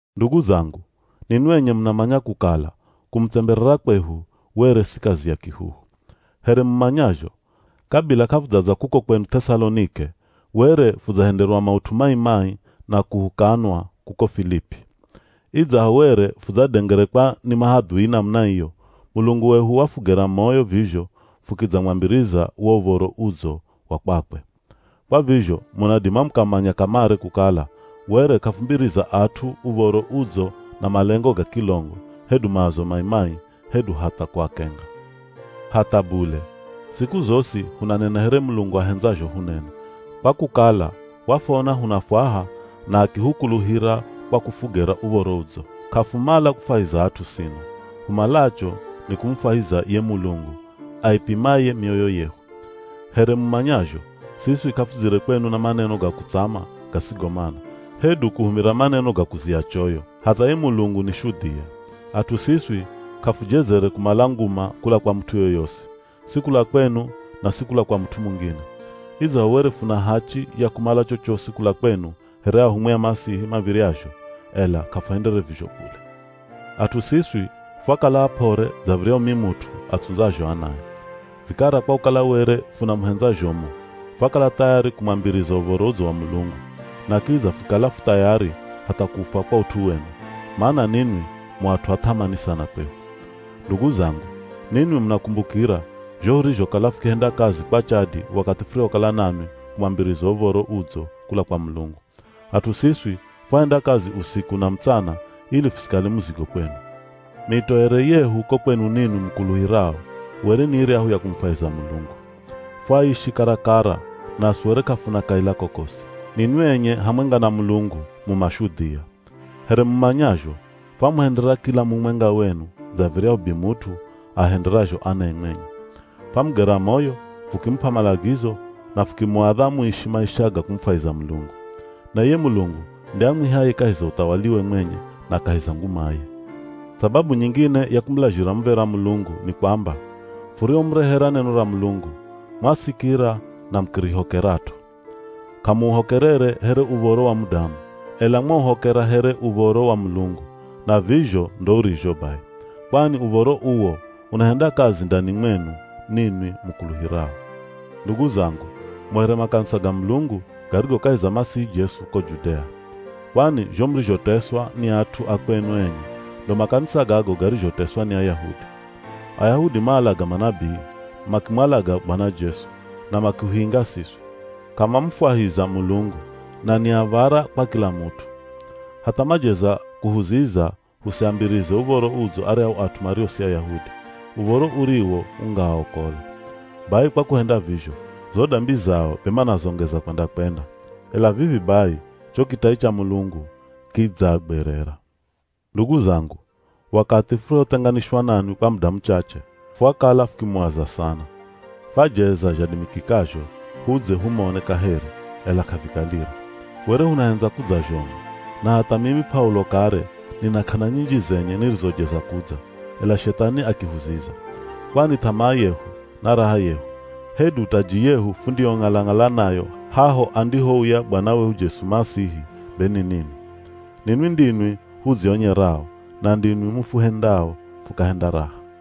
Ndugu zangu, ninwi enye munamanya kukala kumutsemberera kwehu were si kazi ya kihuhu. Here mumanyazho, kabila k'afudzadza kuko kwenu Th'esalonike, were fudzahenderwa maut'u mai-mai na kuhukanwa kuko Filipi. Idzaho were fudzadengerekwa ni mahadhui namuna iyo, Mulungu wehu wafugera moyo vizho fukidzamwambiriza wo Uv̱oro Udzo wa kwakwe. Kwa vizho munadima mukamanya kamare kukala were k'afumbiriza at'u Uv̱oro Udzo na malengo ga kilongo hedu maazo mai-mai hedu hatha kuakenga. Hatha bule, siku zosi hunanena here Mulungu ahendzazho hunene, kwa kukala wafwona hunafwaha na akihukuluhira kwa kufugera Uv̱oro Udzo. K'afumala kufwahiza at'u sino, humalacho ni kumufwahiza ye Mulungu aipimaye mioyo yehu. Here mumanyazho, siswi k'afudzire kwenu na maneno ga kutsama gasigo mana, hedu kuhumira maneno ga kuzia choyo. Hatha ye Mulungu ni shudhia. At'u siswi k'afujezere kumala nguma kula kwa mut'u yoyosi, si kula kwenu na si kula kwa mut'u mungine. Idzaho were funa hachi ya kumala chochosi kula kwenu here ahumwi a Masihi mav̱iryazho, ela k'afuhendere vizho bule. At'u siswi fwakala ap'ore dza viryahu mimut'u atsundzazho anae. Vikara kwa kukala were funamuhendza zhomu, fwakala thayari kumwambiriza Uv̱oro Udzo wa Mulungu, na kidza fukikala fu thayari hatha kufwa kwa ut'u wenu, mana ninwi mu at'u a th'amani sana kwehu. Ndugu zangu, ninwi munakumbukira zho hurizhokala fukihenda kazi kwa chadi wakathi furihokala nanwi kumwambiriza Uv̱oro Udzo kula kwa Mulungu. At'u siswi fwahenda kazi usiku na mutsana ili fusikale muzigo kwenu. Mitoere yehu ko kwenu ninwi mukuluhirao were ni iryahu ya kumufwahiza Mulungu. Fwaishi karakara, naswi were k'afuna kaila kokosi. Ninwi enye hamwenga na Mulungu mu mashudhia. Here mumanyazho, fwamuhendera kila mumwenga wenu dza viryahu bimut'u aahenderazho anae mwenye. Famugera moyo, fukimup'a malagizo, na fukimuadha muishi maisha ga kumufwahiza Mulungu. Na iye Mulungu nde amwihaye kahi za uthawaliwe mwenye na kahi za ngumaye. Sababu nyingine ya kumulazhira muv̱era Mulungu ni kwamba, furihomurehera neno ra Mulungu, mwasikira na mukirihokerat'o. K'amuuhokerere here uv̱oro wa mudamu, ela mwauhokera here uv̱oro wa Mulungu, na vizho ndo urizho bai. Kwani uv̱oro uwo unahenda kazi ndani mwenu ninwi mukuluhirao. Ndugu zangu, mu here makanisa ga Mulungu garigo kahi za Masihi Jesu ko Judea. Kwani zho murizhoteswa ni at'u a kwenu enye, ndo makanisa gago garizhoteswa ni Ayahudi. Ayahudi maalaga manabii, makimwalaga Bwana Jesu, na makihuinga siswi. K'amamufwahiza Mulungu, na ni av̱ara kwa kila mut'u. Hatha majeza kuhuziza husiambirize Uv̱oro Udzo aryahu at'u mario si Ayahudi, Uv̱oro uriwo ungaaokola. Bai kwa kuhenda vizho, zo dambi zao be manazongeza kwenda-kwenda. Ela vivi bai cho kitai cha Mulungu kidzaagwerera. Ndugu zangu, wakathi furihothenganishwa nanwi kwa muda muchache, fwakala fukimuaza sana. Fajeza zhadimikikazho hudze humone kaheri, ela k'avikalire. Were hunahendza kudza zhomu. Na hatha mimi P'aulo kare nina k'ana nyinji zenye nirizojeza kudza, ela Shethani akihuziza. Kwani th'amaa yehu, na raha yehu, hedu taji yehu fundiyong'ala-ng'ala nayo haho andihouya Bwana wehu Jesu Masihi, be ni ninwi. Ninwi ndinwi hudzionyerao na ndinwi mufuhendao fukahenda raha.